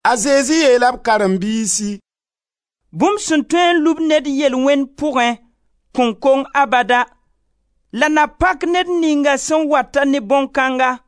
A Zezi yeela b karen-biisi: «Bũmb sẽn tõe n lub ned yel-wẽnd pʋgẽ kõn kong abada la na pak ned ninga sẽn wata ne bõn-kãnga.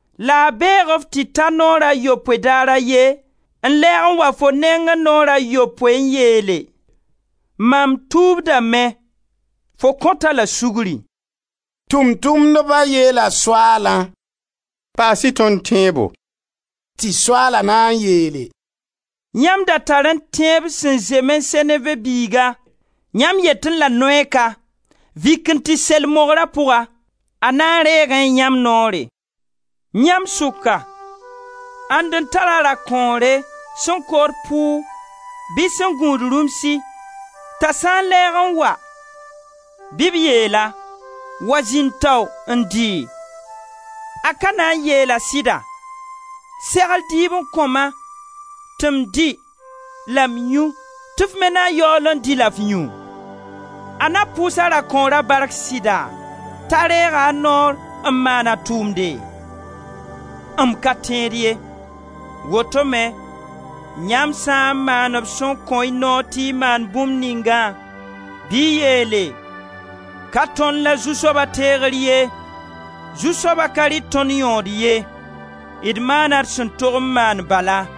La a beeg-f tɩ ta naoor a yopoe daar a ye, n lɛɛg n wa fo nengẽ naoor a yopoe n yeele: ‹Mam tuubdame,› fo kõt-a la sugri.» Tʋʋm-tʋmdba yeela Soaalã: «Paas-y tõnd tẽebo.» Tɩ Soaala na n yeele: «Yãmb da tarẽ tẽeb sẽn zemẽ seneve biiga, yãmb yetẽ la mugnugã: ‹Vik n tɩ sel mogra pʋga!› A na reegẽ yãmb noore. Yãmb sʋka, ãnd n tar-a a dakõore sẽn kood pʋʋg, bɩ sẽn gũud rũmsi t'a sã n lɛɛg n wa bɩ b yeel-a: ‹Wa zĩnd tao n dɩ?› A ka na n yeel-a sɩda: ‹Segl dɩɩb n kõ-ma tɩ m dɩ la m yũ tɩ f me na yaool n dɩ la f yũ?› A na pʋʋs a rakõora bark sɩda t'a reega a noor n maan a tʋʋmde? M ka tẽed ye. Woto me yãmb sã n maand b sẽn kõ-y noor tɩ y maan bũmb ningã bɩ y yeele: ka tõnd la zu-soaba teegr ye, zu-soaba ka rɩt tõnd yõod ye. D maana d sẽn tog n maan bala.»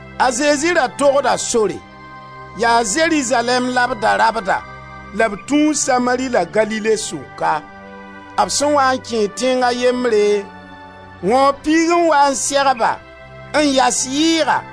A Zezi ra togda sore. Yaa Zerizalɛɛm la b da rabda la b tũu Samari la Galile sʋka. B sẽn waa n kẽed tẽng a yembre, wãoob piig n wa n seg-ba, n yas yɩɩga,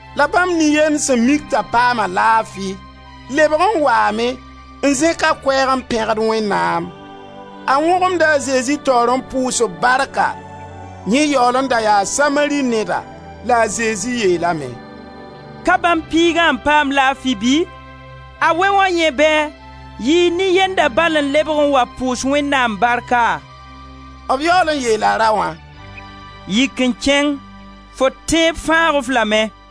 La bãmb nin-yend sẽn mik t'a paama laafi, lebg n waame, n zẽk a koɛɛg n pẽgd Wẽnnaam. A wõgemda a Zezi taoor n pʋʋs-b barka; yẽ yaool n da yaa Samari neda. La a Zezi yeelame: «Ka bãmb piigã n paam laafi bɩ? A wɛ wã yẽ bɛɛ? Yɩɩ nin-yenda bal n lebg n wa pʋʋs Wẽnnaam barka?» B yaool n yeela raoã: «Yik n kẽng, fo tẽeb fãag-f lame.»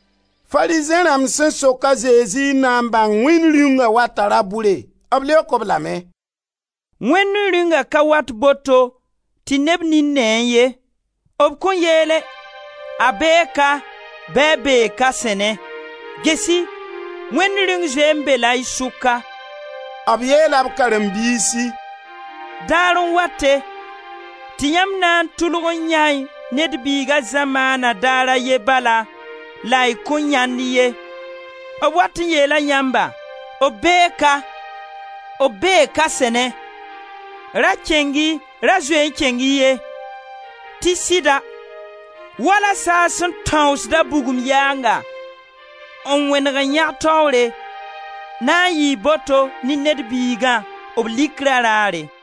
Farizẽ rãmb sẽn sok a Zezi n na n bãng Wẽnd Rĩungã wata ra-bʋre, b leok-b lame: «Wẽnd Rĩungã ka wat boto, tɩ neb nin neẽ ye. B kõn yeele: ‹A bee ka, bɩ a bee ka-sẽnẽ.› Ges-y, Wẽnd Rĩung zoe n be-la y sʋka.» B yeela b karen-biisi: «Daar n wate, tɩ yãmb na n tʋlg n yãe Ned Biiga zamaana daar a ye bala, la y kõn yãend ye. B wat n yeela yãmba: ‹B bee ka,› ‹B bee ka-sẽne,› ra kẽng-y, ra zoe-y n kẽng-y ye. Tɩ sɩda, wala saag sẽn tãoosd a bugum yaanga n wẽneg n yãg taoore, na n yɩɩ boto ne Ned Biigã, b likra raare.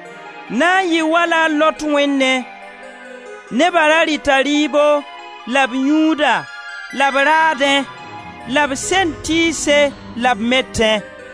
Na n yɩɩ wala a Lot wẽnnẽ. Neba ra rɩta rɩɩbo la b yũuda la b raadẽ la b send tɩɩse la b metẽ,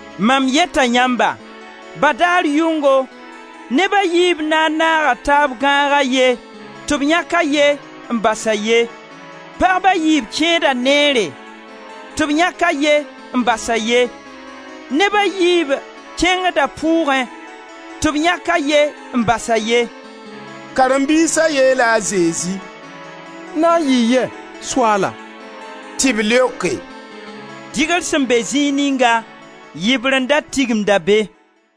Mam yeta yãmba, ba daar yʋngo neb a yiib na n naaga taab gãag a ye, tɩ b yãk a ye n bas a ye. Pagb a yiib kẽeda neere, tɩ b yãk a ye n bas a ye. [ Neb a yiib kẽngda pʋʋgẽ, tɩ b yãk a ye n bas a ye.]» Karen-biisa yeela a Zezi: «Na n yɩ yɛ, Soaala?» Tɩ b leoke: «Dɩgre sẽn be zĩig ninga, yibrendã tigimda be.»